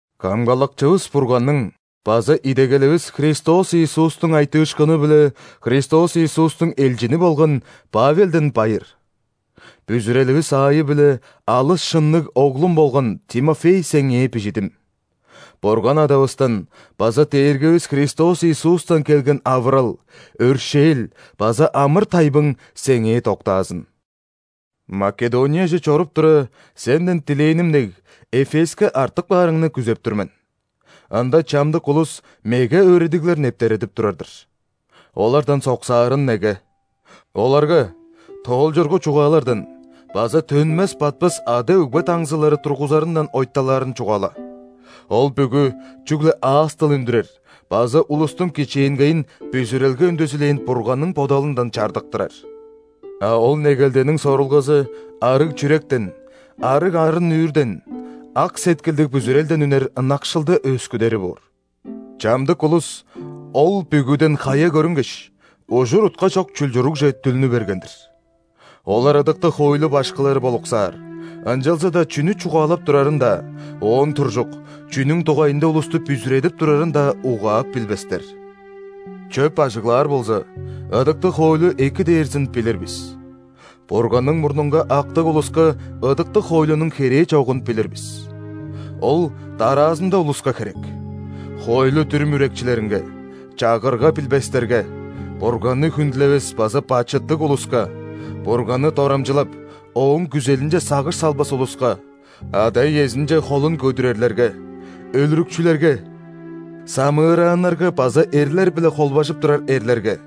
Камгалакчывыс Бурганның база идегеливис Христос Иисустуң айтыышкыны-биле Христос Иисустуң элчини болган Павелден байыр. Бүзүреливис аайы-биле алыс шынныг оглум болган Тимофей сеңээ бижидим. Бурган Адавыстан база Дээргивис Христос Иисустан келген авырал, өршээл база амыр-тайбың сеңээ доктаазын! Македонияже чоруп тура, сенден дилээним дег, Эфеске артып каарыңны күзеп тур мен. Ында чамдык улус меге өөредиглер нептередип турар-дыр. Олардан соксаарын неге. Оларга тоолчургу чугаалардан база төнмес-батпас ада-өгбе даңзылары тургузарындан ойталаарын чугаала. Ол бүгү чүгле аас-дыл үндүрер база улустуң кичээнгейин бүзүрелге үндезилээн Бурганның бодалындан чардыктырар. А ол негелдениң сорулгазы – арыг чүректен, арыг арын-нүүрден, ак сеткилдиг бүзүрелден үнер ынакшылды өөскүдери боор. Чамдык улус ол бүгүден хая көрүнгеш, ужур-утка чок чулчуругже дүлнү берген-дир. Олар ыдыктыг хоойлу башкылары болуксаар, ынчалза-даа чүнү чугаалап турарын-даа, оон туржук, чүнүң дугайында улусту бүзүредип турарын-даа угаап билбестер. Чөп ажыглаар болза, ыдыктыг хоойлу эки дээрзин билир бис. Бурганның мурнунга актыг улуска ыдыктыг хоойлунуң херээ чогун билир бис. Ол дараазында улуска херек: хоойлу-дүрүм үрекчилеринге, чагырга билбестерге; Бурганны хүндүлевес база бачыттыг улуска; Бурганны дорамчылап, Ооң күзелинче сагыш салбас улуска; ада-иезинче холун көдүрерлерге, өлүрүкчүлерге; самыырааннарга база эрлер-биле холбажып турар эрлерге;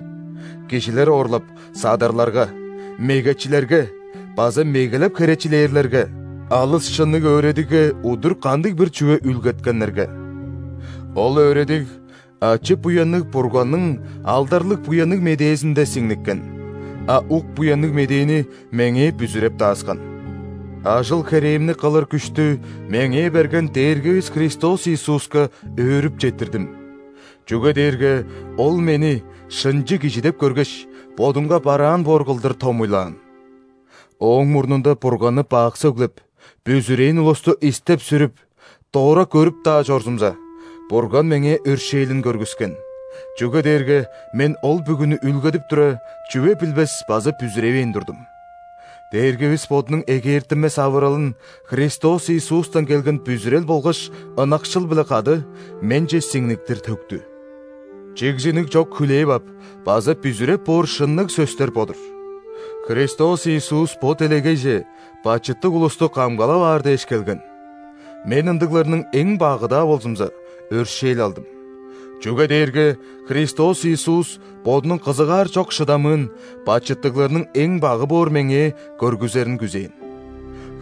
кижилер оорлап, садарларга, мегечилерге база мегелеп херечилээрлерге; алыс шынныг өөредигге удур кандыг-бир чүве үүлгеткеннерге. Ол өөредиг ачы-буянныг Бурганның алдарлыг Буянныг Медээзинде сиңниккен, а ук Буянныг Медээни меңээ бүзүреп дааскан. Ажыл-херээмни кылыр күштү меңээ берген Дээргивис Христос Иисуска өөрүп четтирдим. Чүге дээрге Ол мени шынчы кижи деп көргеш, Бодунга бараан боор кылдыр томуйлаан. Ооң мурнунда Бурганны бак сөглеп, бүзүрээн улусту истеп-сүрүп, дора көрүп-даа чорзумза, Бурган меңээ өршээлин көргүскен, чүге дээрге мен ол бүгүнү үүлгедип тура, чүве билбес база бүзүревээн турдум. Дээргивис Бодунуң эгээртинмес авыралын Христос Иисустан келген бүзүрел болгаш ынакшыл-биле кады менче сиңниктир төктү. Чигзиниг чок хүлээп ап база бүзүреп боор шынныг сөстер бо-дур: Христос Иисус бо делегейже бачыттыг улусту камгалап аар дээш келген. Мен ындыгларның эң багы-даа болзумза, өршээл алдым, чүге дээрге Христос Иисус Бодунуң кызыгаар чок шыдамыын бачыттыгларның эң багы боор меңээ көргүзерин күзээн.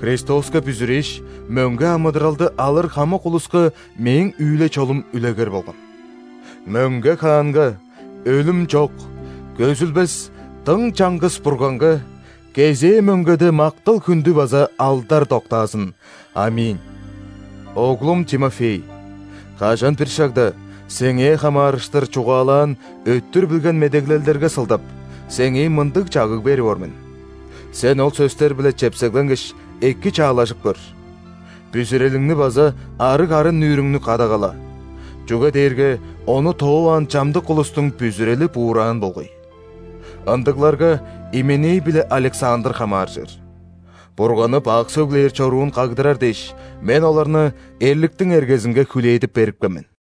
Христоска бүзүрээш, мөңге амыдыралды алыр хамык улуска мээң үүле-чолум үлегер болган. Мөңге Хаанга, өлүм чок, көзүлбес дың чаңгыс Бурганга кезээ мөңгеде мактал-хүндү база алдар доктаазын! ·Аминь. Оглум Тимофей, кажан-бир шагда сеңээ хамаарыштыр чугаалаан өттүр билген медеглелдерге сылдап, сеңээ мындыг чагыг берип ор мен. Сен ол сөстер-биле чепсегленгеш, эки чаалажып көр. Бүзүрелиңни база арыг арын-нүүрүңнү кадагала, чүге дээрге ону тооваан чамдык улустуң бүзүрели буураан болгай. Ындыгларга Именей биле Александр хамааржыр. Бурганны бак сөглээр чоруун кагдырар дээш, мен оларны эрликтиң эргезинге хүлээдип берипкен мен.